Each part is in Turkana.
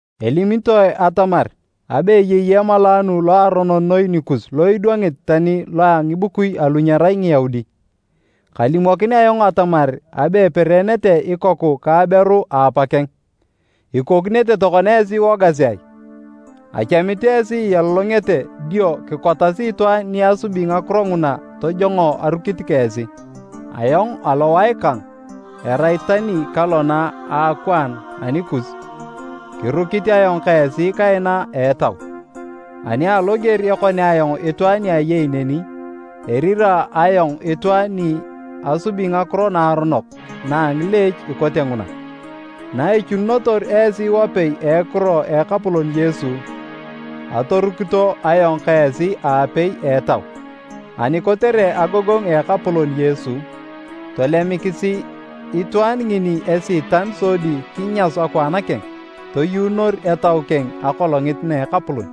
Elimitoe atamar abe eyei emalaanu loaronon noi nikus lo idwangit tani lo a ngibukui alu nyerai Ngiyaudi. Kalimokin ayong atamar abe epereenete ikoku ka aberu a apakeng! Ikokinete tokona esi iwogasi ai? Achamit esi ialolongete dio kikotasi itwaan ni asubi ngakiro nguna tojongo arukit ka esi. Ayong alowae kang erai tani kalona a akwaan anikus, kirukit ayong ka esi kaina a etau. Ani aloger ekonea ayong itwaan ni ayei neni, erira ayong itwaan ni asubi ngakiro naaronok na a ngileech ikote nguna. Naichununotor esi wapei a ekiro a Ekapolon Yesu, atorukito ayong ka esi aapei a etau, ani kotere agogongu a Ekapolon Yesu, tolemikisi itwaan ngini Esiitan sodi kinyasu akwaan keng, toyuunor etau keng Akolongit na a Ekapolon.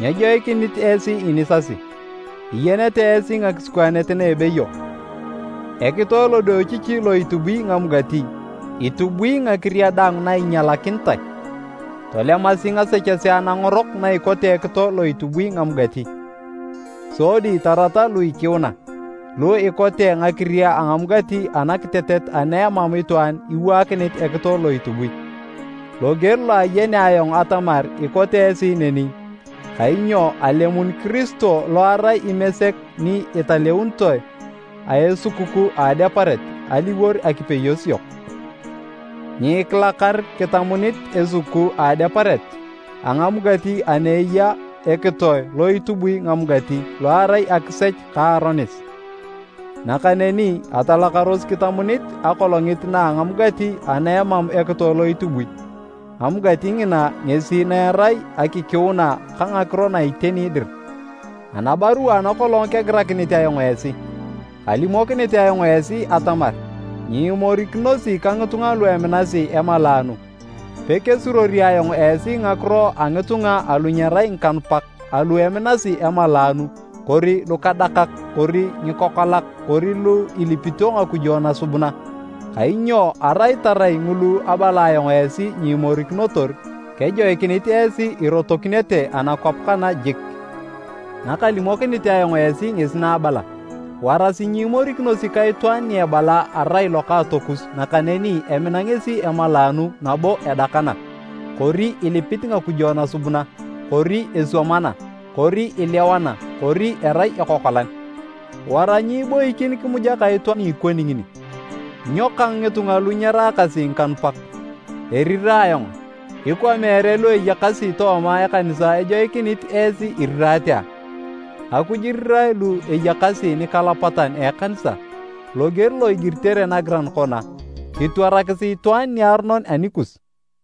Nyejoikinit esi inisasi! Iyenete esi ngakisikwaanet na ebeyo, “Ekitoe lodiochichi lo itubui ngamugati, itubui ngakiria daang na inyalakinitae.” Tolemasi ngasechesea nangorok na ikote ekitoe lo itubui ngamugati, sodi tarata lu ikiuna, lu ikote ngakiria a ngamugati anakitetet ana emam itwaan iwaakinit ekitoe lo itubui. Loger lo ayenea ayong atamar ikote esi neni, kainyo alemun Kiristo lo erai Imesek ni italeunitoe a esukukuu a Adeparet, aliwor akipeyos yok. Nyikilakar kitamunit esukukuu a Adeparet, a ngamugati ana eya ekitoe lo itubui ngamugati lo erai akisech ka aronis. Nakaneni atalakaros kitamunit akolongit na a ngamugati ana emam ekitoe lo itubui, amugati ngina ngesi na erai akikiuna ka ngakiro na iteni dir. Anabarua ana kolong kegirakinit ayong esi, kalimokinit ayong esi atamar nyiimorikinosi ka ngitunga lu eminasi emalaanu. Pekesuruori ayong esi ngakiro a ngitunga alu nyerai ngikanupak alu eminasi emalaanu kori lukadakak kori ngikokolak kori lu ilipito ngakujo nasubuna, kainyo arai tarai ngulu abala ayong esi nyiimorikinotor, kejoikinit esi irotokinete anakwap kana jik. Nakalimokinit ayong esi ngesi na abala, warasi nyiimorikinosi ka itwaan ni ebala arai lokaatokus nakaneni emina ngesi emalaanu nabo edakana, kori ilipit ngakujo nasubuna, kori eswamana kori ilewana kori erai ekokolan. Wara nyiiboikin kimuja ka itwaan ni ikoni ngini. Nyo kang ngitunga lu nyeraakasi ngikanupak, eriraa ayong? Ikwa meere lu eyakasi tooma ekanisa ejoikinit esi iriraate a? Akuj irirae lu eyakasi nikalapatan a ekanisa. Loger lo igiritere nagiran kona: “Kitwarakisi itwaan niaronon anikus.”